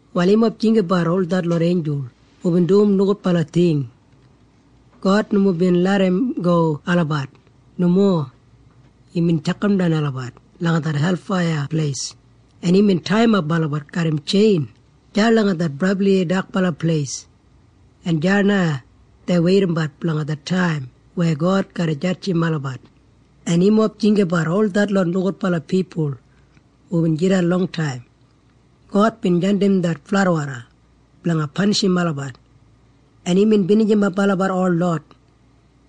Wal yumob jinggabat ol detlot einjul hubin dum nogudbala ting. God nomo bin larramgo olabat. Nomo. Imbin tjakamdan olabat langa det helfaiya, en imbin taiyimap olabat garram tjein deya langa det brabli dakbala pleis, en deya na dei weidabat blanga det taim weya God garra jadjim olabat. En yumob jinggabat ol detlot nogudbala pipul hubin jidan longtaim. God bin jandim det fladwoda blanga panishim olabat, en imbin binijimap olabat holot.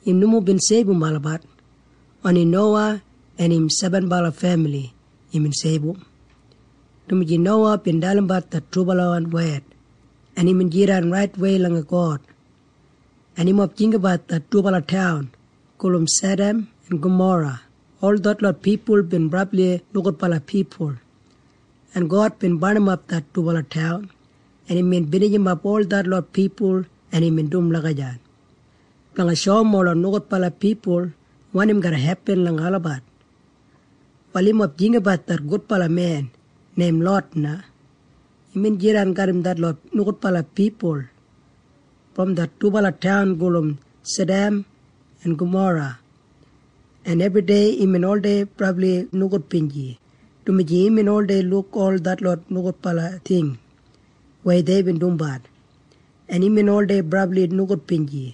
Im nomo bin seibum olabat. Oni Nowa en im sebenbala femili imbin seibum, dumaji Nowa bin dalimbat det trubalawan wed en imbin jidan raitwei langa God. En yumob jinggabat det dubala taun gulum Sadam en Gamora. Ol detlot pipul bin brabli nogudbala pipul, en God bin barnimap det dubala taun, en imbin binijimap ol detlot pipul, en imbin dum lagijat blanga shoum ola nogudbala pipul wanim garra hepin langa olabat. Wal yumob jinggabat det gudbala men neim Lot na. Imbin jidan garram detlot nogudbala pipul brom det dubala taun gulum Sadam en Gamora, en ebridei imbin oldei brabli nogudbinji, dumaji imbin oldei luk ol detlot nogudbala ting weya deibin dumbat, en imbin oldei brabli nogudbinji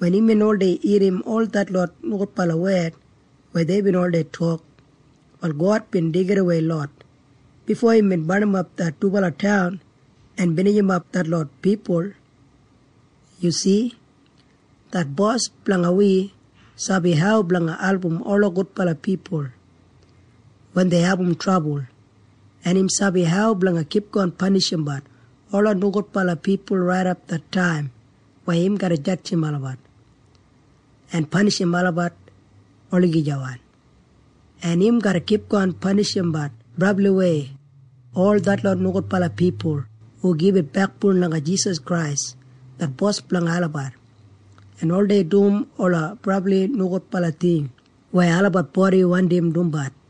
wen imbin oldei irrim ol detlot nogudbala wed weya deibin oldei tok. Wal God bin deigidawei Lot bifo imbin barnimap det dubala taun en binijimap detlot pipul. Yu si? Det Bos blanga wi sabi hau blanga album ola gudbala pipul wen dei abum trabul, en im sabi hau blanga kipgon panishimbat ola nogudbala pipul raidap det taim weya im garra jadjim olabat en panishim olabat olagijawan. En im garra kipgon panishimbat brabliwei ol detlot nogudbala pipul hu oldei gibit bekboun langa Jisas Krais det Bos blanga olabat en oldei dum ola brabli nogudbala ting weya olabat bodi wandim dumbat.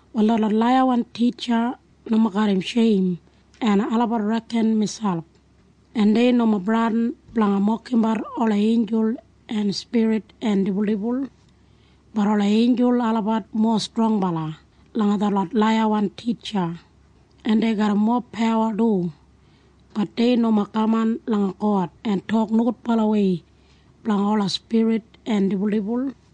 Wal detlot laiyawan titja nomo garram sheim, en olabat reken miselp, en dei nomo bradin blanga mokimbat ola einjul en spirit en dibuldibul. Bat ola einjul olabat mowa strongbala langa detlot laiyawan titja, en dei garram mowa pawa du. Bat dei nomo kaman langa God en tok nogudbalawei blanga ola spirit en dibuldibul.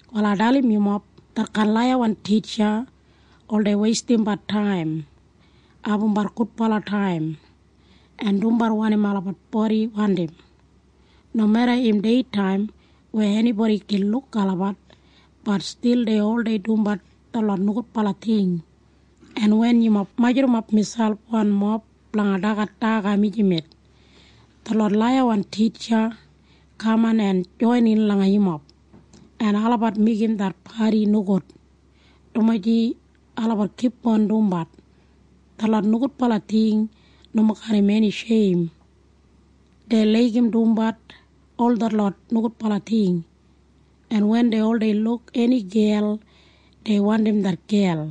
Wal ai dalim yumob. Detkain laiyawan titja oldei weistimbat taim en abumbat gudbala taim en dumbat wanim olabat bodi oldei wandim. Nomeda im deitaim weya enibodi gin luk olabat, bat stil dei oldei dumbat detlot nogudbala ting. En wen yumob majurrumap miselp wanmob blanga dagat daga mijamet, detlot laiyawan titja kaman en joinin langa yumob, en olabat meigim det padi nogud, dumaji olabat kipgon dumbat detlot nogudbala ting nomo garram eni sheim. Dei laigim dumbat ol detlot nogudbala ting, en wen dei oldei luk eni gel, dei wandim det gel,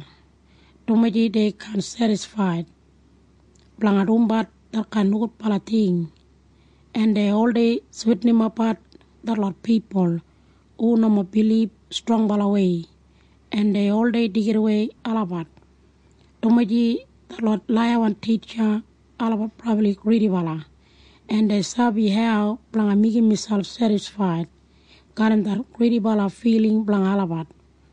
dumaji dei kaan sedisfaid blanga dumbat detkain nogudbala ting, en dei oldei switinimapbat detlot pipul hu nomo bilib strongbalawei, en dei oldei deigidawei olabat, dumaji detlot laiyawan titja olabat brabli gridibala, en dei sabi hau blanga meigim miselp sedisfaid garram det gridibala filing blanga olabat.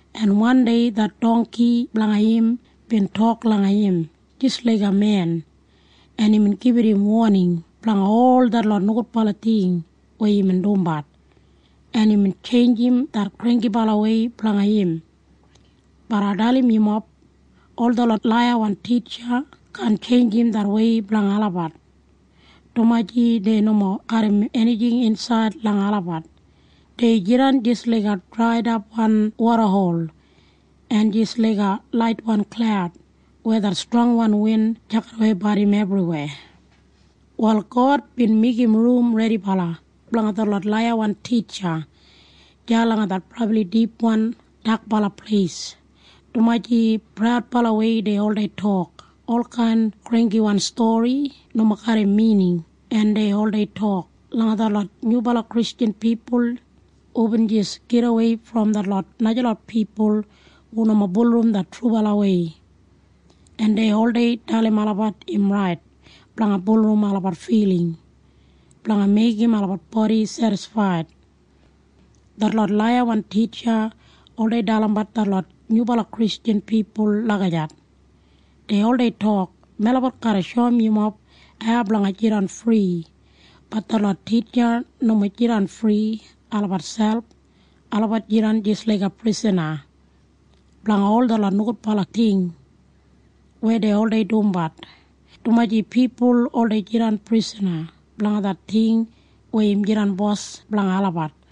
en wandei det dongki blanga im bin tok langa im jis laiga men, en imbin gibit im woning blanga ol detlot nogudbala ting weya imbin dumbat, en imbin tjeinjim det granggibalawei blanga im. Bat ai dalim yumob. Ol detlot laiyawan titja kaan tjeinjim det wei blanga olabat, dumaji dei nomo garram enijing insaid langa olabat. Dei jidan jis laiga draiwan wodahol en jis laiga laitwan klaud weya det strongwan win tjakidaweibat im ebriweya. Wal God bin meigim rum redibala blanga detlot laiyawan titja deya langa det brabli dipwan dakbala pleis, dumaji praudbalawei dei oldei tok olkain granggiwan stori nomo garram mining, en dei oldei tok langa detlot nyubala Kristjan pipul hubin jis gidawei brom detlot najalot pipul hu nomo bulurrum det trubalawei, en dei oldei dalim olabat im rait blanga bulurrum olabat filing blanga meigim olabat bodi sedisfaid. Detlot laiyawan titja oldei dalimbat detlot nyubala Kristjan pipul lagijat. Dei oldei tok, “Melabat garra shoum yumob hau blanga jidan fri.” Bat detlot titja nomo jidan fri olabat selp. Olabat jidan jis laiga prisana blanga ol detlot nogudbala ting weya dei oldei dumbat, dumaji pipul oldei jidan prisana blanga det ting weya im jidan bos blanga olabat.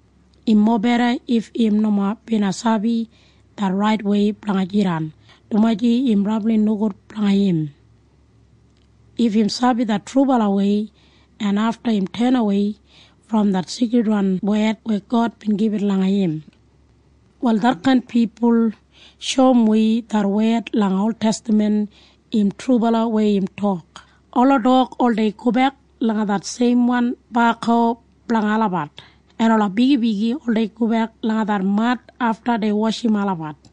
Im mobeda if im nomo bina sabi det raitwei blanga jidan, dumaji im brabli nogud blanga im if im sabi det trubalawei en afta im tenawei brom det seikridwan wed weya God bin gibit langa im. Wal detkain pipul shoum wi det wed langa oltestaman im trubala weya im tok, “Ola dog oldei gobek langa det seimwan baku blanga olabat, en ola bigibigi oldei gobek langa det mad afta dei washim olabat.”